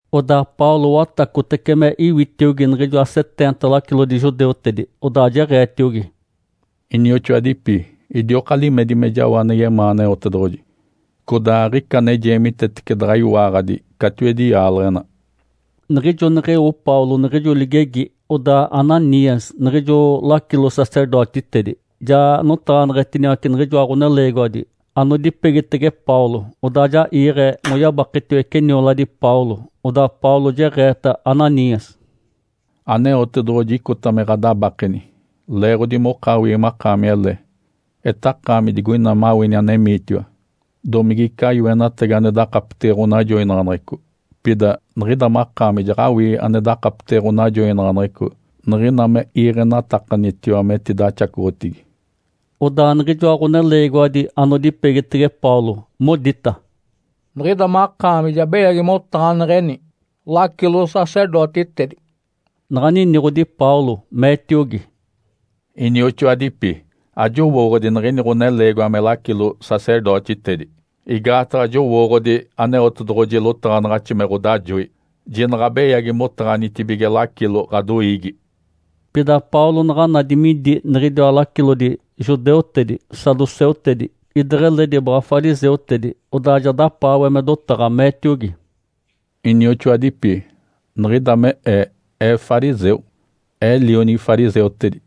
Odaa Paulo watacotece me iwitiogi niɡ̶ijoa seteenta lacilodi judeutedi, odaa jeɡ̶eetiogi, “Inioxoadipi, idioka limedi me jao ane yemaa Aneotedoɡ̶oji, codaa aɡ̶ica ane jeemitetece daɡ̶a iwaaɡ̶adi catiwedi yaaleɡ̶ena.” Niɡ̶ijo neɡ̶eo Paulo niɡ̶ijo ligegi, odaa Ananias, niɡ̶ijo lacilo-sacerdotitedi, ja notaɡ̶aneɡ̶etiniwace niɡ̶ijoa ɡ̶oneleegiwadi anodipegitege Paulo, odaa ja iiɡ̶e moyabaketiwece nioladi Paulo. Odaa Paulo jeɡ̶eeta Ananias, “Aneotedoɡ̶oji icota me ɡ̶adabakeni, leeɡ̶odi mokawii makaami ele. Etakaami digoina mawini anemiitiwa, domigica yoenatagi ane dakapetege ɡ̶onajoinaɡ̶aneɡ̶eco? Pida niɡ̶ida makaami jaɡ̶awii ane dakapetege ɡ̶onajoinaɡ̶aneɡ̶eco niɡ̶ina me iiɡ̶enatakanitiwa metidaxacoɡ̶otigi.” Odaa niɡ̶ijoa ɡ̶oneleegiwadi anodipegitege Paulo modita, “Niɡ̶ida makaami ja beyagi motaɡ̶aneɡ̶eni lacilo-sacerdotitedi.” Naɡ̶a niniɡ̶odi Paulo, meetiogi, “Inioxoadipi, ajowooɡ̶odi niɡ̶ini ɡ̶oneleegiwa me lacilo-sacerdotitedi. Igaataɡ̶a jowooɡ̶odi Aneotedoɡ̶oji lotaɡ̶anaɡ̶axi me ɡ̶odajoi, ‘Jinaɡ̶a beyagi motaɡ̶anitibige lacilo ɡ̶adoiigi.’” Pida Paulo naɡ̶a nadi midi niɡ̶idiwa lacilodi judeutedi, saduceutedi, ideɡ̶eledi baɡ̶a fariseutedi, odaa ja dapaawe me dotaɡ̶a, meetiogi, “Inioxoadipi, niɡ̶ida me ee, ee fariseu, ee lionigi fariseutedi.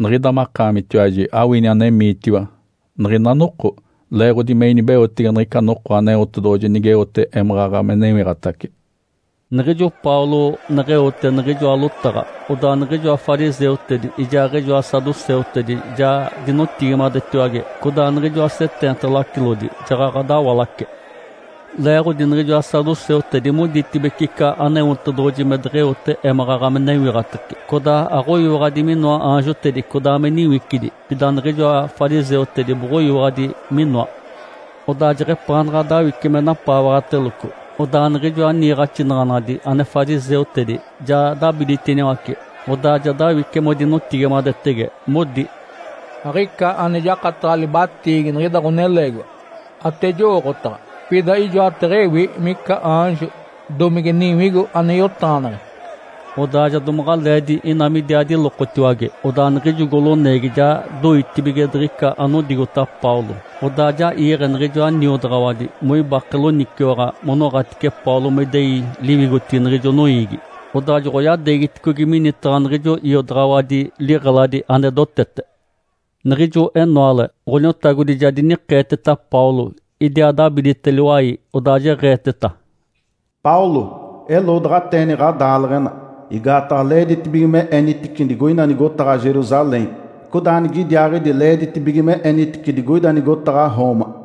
Niɡ̶ida makaamitiwaji awini anemiitiwa niɡ̶ina noko leeɡ̶odi me inibeotege niɡ̶ica noko Aneotedoɡ̶oji nigeote émaɡ̶aɡ̶a me newiɡ̶atace.” Niɡ̶ijo Paulo neɡ̶eote niɡ̶ijoa lotaɡ̶a, odaa niɡ̶ijoa fariseutedi ijaaɡ̶ijoa saduceutedi ja dinotigimadetiwage, codaa niɡ̶ijoa seteenta lacilodi jaɡ̶aɡ̶a dawalace. Leeɡ̶odi niɡ̶ijoa saduceutedi moditibece ica Aneotedoɡ̶oji me deɡ̶eote émaɡ̶aɡ̶a me newiɡ̶atace, codaa aɡ̶oyiwaɡ̶adi minoa aanjotedi codaa me niwicidi. Pida niɡ̶ijoa fariseutedi boɡ̶oyiwaɡ̶adi minoa. Odaa jeɡ̶epaanaɡ̶a dawice me napaawaɡ̶ateloco, odaa niɡ̶ijoa niiɡ̶axinaɡ̶anadi ane fariseutedi ja dabiditiniwace, odaa ja dawice modinotigimadetege, modi, “Aɡ̶ica ane jakataɡ̶a libatiigi niɡ̶ida ɡ̶oneleegiwa. Ate jowooɡ̶otaɡ̶a, pida ijoateɡ̶ewi mica aanjo domige niwigo ane yotaɡ̶aneɡ̶e.” Odaa ja domaɡ̶aleedi ina midiaa dilokotiwage, odaa niɡ̶ijo goloneegi ja doitibige diɡ̶ica anodigota Paulo. Odaa ja iiɡ̶e niɡ̶ijoa niodaɡ̶awadi moibake loniciwaɡ̶a monoɡ̶atice Paulo me idei liwigotigi niɡ̶ijo noiigi. Odaa joɡ̶oyadeegiticogi minitaɡ̶a niɡ̶ijo iodaɡ̶awadi liɡ̶eladi ane dotete. Niɡ̶ijo enoale Ǥoniotagodi ja dinikeeteta Paulo, idiaa dabidite liwai, odaa jeɡ̶eeteta, “Paulo, eloodaɡ̶ateeni ɡ̶adaaleɡ̶ena. Igaataɡ̶a leeditibige me enitici digoina nigotaɡ̶a Jerusalém. Codaa nigidiaaɡ̶idi leeditibige me enitici digoida nigotaɡ̶a Roma.”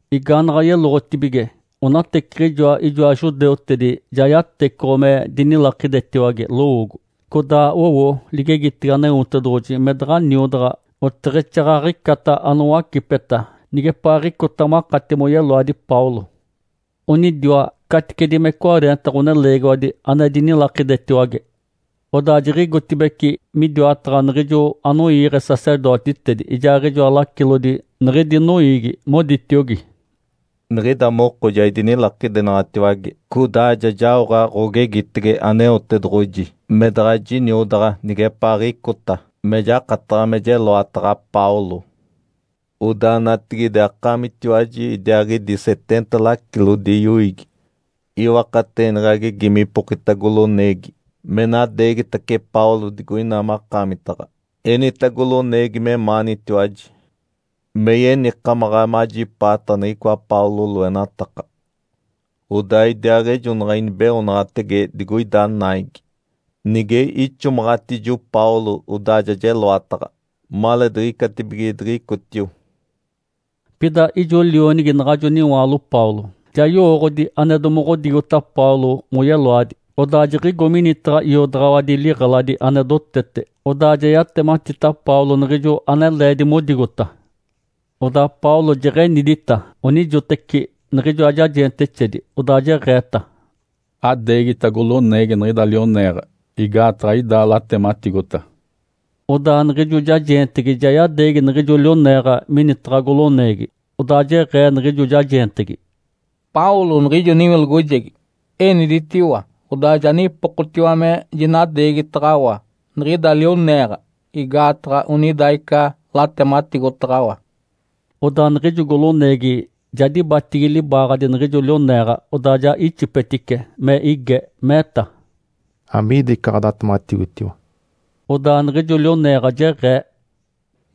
Igaanaɡ̶a yeloɡ̶otibige, onateciɡ̶ijoa ijoa judeutedi ja yatecoɡ̶o me dinilakidetiwage lowoogo. Codaa owo ligegitege Aneotedoɡ̶oji me daɡ̶a niodaɡ̶a oteɡ̶exaaɡ̶aɡ̶icata anowacipeta nigepaaɡ̶icota makati moyeloadi Paulo. Onidiwa caticedi me cwareenta ɡ̶oneleegiwadi ane dinilakidetiwage. Odaa jiɡ̶igotibeci midiwataɡ̶a niɡ̶ijo anoiiɡ̶e sacerdotitedi ijaaɡ̶ijoa lacilodi niɡ̶idi noiigi, moditiogi, “Niɡ̶ida moko ja idinilakidenaɡ̶atiwage codaa ja jaoɡ̶a ɡ̶ogegitege Aneotedoɡ̶oji me daɡ̶a jiniodaɡ̶a nigepaaɡ̶icota me jakataɡ̶a me jeloataɡ̶a Paulo. Odaa natigide, akaamitiwaji idiaaɡ̶idi seteenta lacilodi yoiigi iwakateeni ɡ̶agegi mipokita goloneegi me nadeegitace Paulo digoina makaamitaɡ̶a. Enita goloneegi memaanitiwaji me yenikamaɡ̶a majipaata niɡ̶icoa Paulo loenataka. Odaa idiaaɡ̶ejonaɡ̶a inibeoonaɡ̶atege digoida naigi. Nige ixomaɡ̶atijo Paulo, odaa ja jeloataɡ̶a, maleediɡ̶icatibige diɡ̶icotio.” Pida ijo lionigi naɡ̶ajo niwaalo Paulo ja yowooɡ̶odi ane domoɡ̶odigota Paulo moyeloadi. Odaa jiɡ̶igo minitaɡ̶a iodaɡ̶awadi liɡ̶eladi ane dotete, odaa ja yatematita Paulo niɡ̶ijo ane leedi modigota. Odaa Paulo jeɡ̶enidita onijoteci niɡ̶ijoa jajeentexedi, odaa jeɡ̶eeta, “Adeegita goloneegi niɡ̶ida lioneeɡ̶a. Igaataɡ̶a ida latematigota.” Odaa niɡ̶ijo jajeentegi ja yadeegi niɡ̶ijo lioneeɡ̶a minitaɡ̶a goloneegi, odaa jeɡ̶ee niɡ̶ijo jajeentegi, “Paulo, niɡ̶ijo niwilogojegi, eniditiwa, odaa ja nipokotiwa me jinadeegitaɡ̶awa niɡ̶ida lioneeɡ̶a. Igaataɡ̶a onida ica latematigotaɡ̶awa.” Odaa niɡ̶ijo goloneegi ja dibatigi libaaɡ̶adi niɡ̶ijo lioneeɡ̶a, odaa ja ixipetice me ige, meeta, “Amiida ica ɡ̶adatematigotiwa?” Odaa niɡ̶ijo lioneeɡ̶a jeɡ̶ee,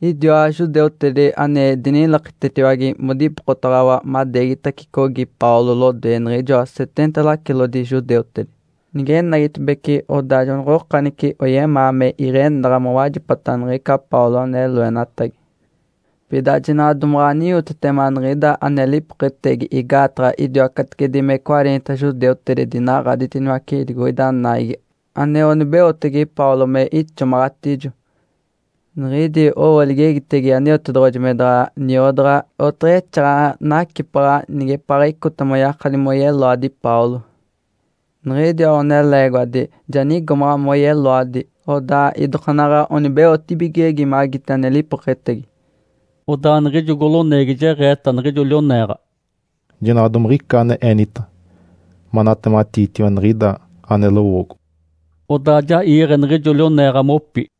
“Idiwa judeutedi ane dinilakidetiwage modipokotaɡ̶awa madeegitacicogi Paulo lodoe niɡ̶ijoa seteenta lacilodi judeutedi. Nigenagitibeci, odaa jonoɡ̶okanice oyemaa me iɡ̶enaɡ̶a mowajipata niɡ̶ica Paulo ane loenatagi. Pida jinaɡ̶a domaɡ̶a aniwotitema niɡ̶ida ane lipoketegi, igaataɡ̶a idiwa caticedi me cwareenta judeutedi dinaɡ̶aditiniwace digoida naigi ane onibeotege Paulo me ixomaɡ̶atijo. Niɡ̶idi owo ligegitege Aneotedoɡ̶oji me daɡ̶a niodaɡ̶a oteɡ̶exaaɡ̶aɡ̶a nacipaɡ̶a nigepaaɡ̶icota moyakadi moyeloadi Paulo. Niɡ̶idiwa ɡ̶oneleegiwadi ja nigomaɡ̶a moyeloadi, odaa idokaanaɡ̶a onibeotibigege magiti ane lipoketegi.” Odaa niɡ̶ijo goloneegi jeɡ̶eeta niɡ̶ijo lioneeɡ̶a, “Jinaɡ̶a domiɡ̶ica ane enita manatematiitiwa niɡ̶ida ane lowoogo.” Odaa ja iiɡ̶e niɡ̶ijo lioneeɡ̶a mopi.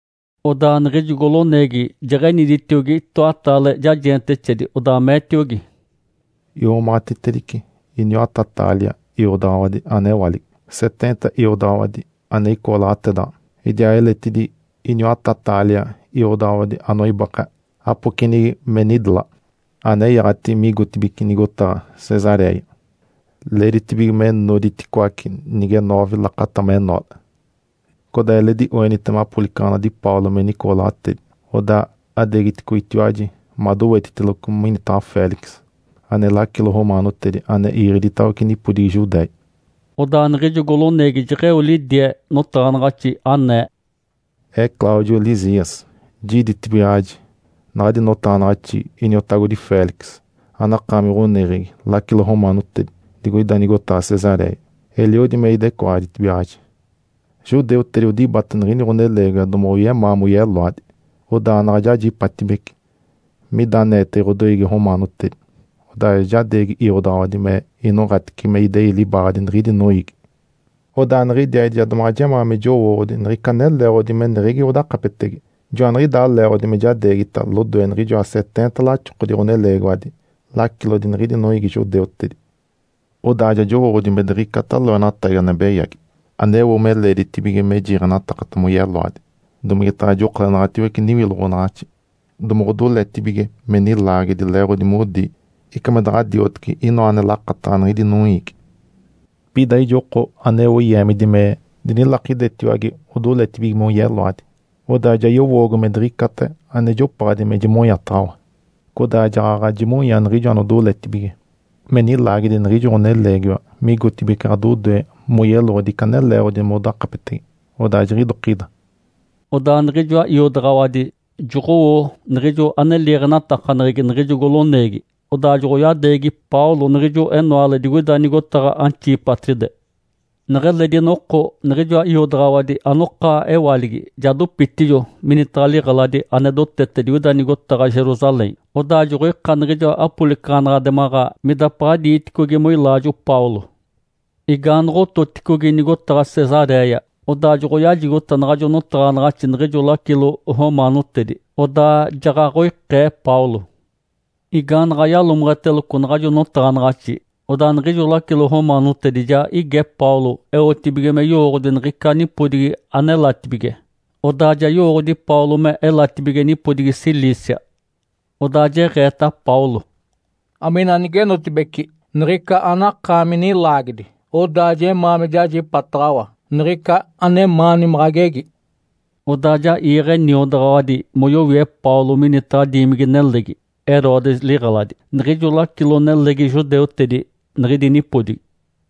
Odaa niɡ̶ijo goloneegi jeɡ̶eniditiogi itoataale jajeentexedi, odaa meetiogi, “Iomaɡ̶atitedice iniwata-taalia iodaɡ̶awadi ane ewaligi, seteenta iodaɡ̶awadi ane icooɡ̶olatedaɡ̶a, idiaa eletidi iniwata-taalia iodaɡ̶awadi anoibake apocenigi me nidelaɡ̶a, anenyaɡ̶ati migotibeci nigotaɡ̶a Cesaréia. Leeditibige me noditicoaci nige noove lakata menoale. Codaa eledi oenitema apolicaɡ̶anadi Paulo menicooɡ̶olatedi, odaa ɡ̶adeegiticogitiwaji madowetiteloco minitaɡ̶a Félix, ane lacilo romaanotedi ane iiɡ̶e iditawece nipodigi Judéia.” Odaa niɡ̶ijo goloneegi jeɡ̶eo lidie notaɡ̶anaɡ̶axi anee, “Ee Cláudio Lísias. Jiditibigaɡ̶aji naɡ̶adi notaɡ̶anaɡ̶axi, iniotagodi Félix, anakaami ɡ̶oneɡ̶egi lacilo romaanotedi digoida nigotaɡ̶a Cesaréia. Eliodi me idecoaditibigaɡ̶aji. Judeutedi odibata niɡ̶ini ɡ̶oneleegiwa domoɡ̶oyemaa moyeloadi. Odaa naɡ̶a jajipatibece mida aneetege ɡ̶odoiigi romaanotedi, odaa ja jadeegi iodaɡ̶awadi me inoɡ̶atice me idei libaaɡ̶adi niɡ̶idi noiigi. Odaa niɡ̶idiaaɡ̶idi ja domaɡ̶a jemaa me jowooɡ̶odi niɡ̶ica ane leeɡ̶odi meneɡ̶egi odakapetege. Joaniɡ̶idaa leeɡ̶odi me jadeegita lodoe niɡ̶ijoa seteenta laxokodi ɡ̶oneleegiwadi lacilodi niɡ̶idi noiigi judeutedi. Odaa ja jowooɡ̶odi me diɡ̶icata loenatagi ane beyagi aneo me leeditibige me jiiɡ̶enatakata moyeloadi, domigetaɡ̶a jokolenaɡ̶atiwece niwiloɡ̶onaɡ̶axi. Domoɡ̶odoletibige me nilaagedi leeɡ̶odi modi ica me daɡ̶a dioteci inoa ane lakataɡ̶a niɡ̶idi noiigi. Pida ijo oko aneo yeemidi me dinilakidetiwage odoletibige moyeloadi. Odaa ja yowoogo me diɡ̶icata ane jopaɡ̶adi me jimonyataɡ̶awa. Codaa jaɡ̶aɡ̶a jimonya niɡ̶ijo anodoletibige me nilaagedi niɡ̶ijo ɡ̶oneleegiwa migotibeci ɡ̶adodoe moyeloɡ̶odi ica ane leeɡ̶odi modakapetege. Odaa jiɡ̶idokida.” Odaa niɡ̶ijoa iodaɡ̶awadi joɡ̶owo niɡ̶ijo ane liiɡ̶enatakaneɡ̶egi niɡ̶ijo goloneegi. Odaa joɡ̶oyadeegi Paulo niɡ̶ijo enoale digoida nigotaɡ̶a Antipátride. Neɡ̶eledi noko niɡ̶ijoa iodaɡ̶awadi anokewaligi ja dopitijo minitaɡ̶a liɡ̶eladi ane dotete digoida nigotaɡ̶a Jerusalém, odaa joɡ̶oika niɡ̶ijoa apolicaɡ̶anaɡ̶ademaɡ̶a midapaɡ̶a diiticogi moilaajo Paulo. Igaanoɡ̶ototicogi nigotaɡ̶a Cesaréia, odaa joɡ̶oyajigota naɡ̶ajo notaɡ̶anaɡ̶axi niɡ̶ijo lacilo romaanotedi, odaa jaɡ̶aɡ̶oikee Paulo. Igaanaɡ̶a yalomeɡ̶eteloco naɡ̶ajo notaɡ̶anaɡ̶axi, odaa niɡ̶ijo lacilo romaanotedi ja ige Paulo eotibige me yowooɡ̶odi niɡ̶ica nipodigi anelatibige. Odaa ja yowooɡ̶odi Paulo melatibige nipodigi Cilícia. Odaa jeɡ̶eeta Paulo, “Amina nigenotibeci niɡ̶ica anakaami nilaagedi, odaa jemaa me jajipataɡ̶awa niɡ̶ica anemaani me ɡ̶agegi.” Odaa ja iiɡ̶e niodaɡ̶awadi moyowie Paulo minitaɡ̶a diimigi-nelegi, Herodes liɡ̶eladi, niɡ̶ijo lacilo-nelegi judeutedi niɡ̶idi nipodigi.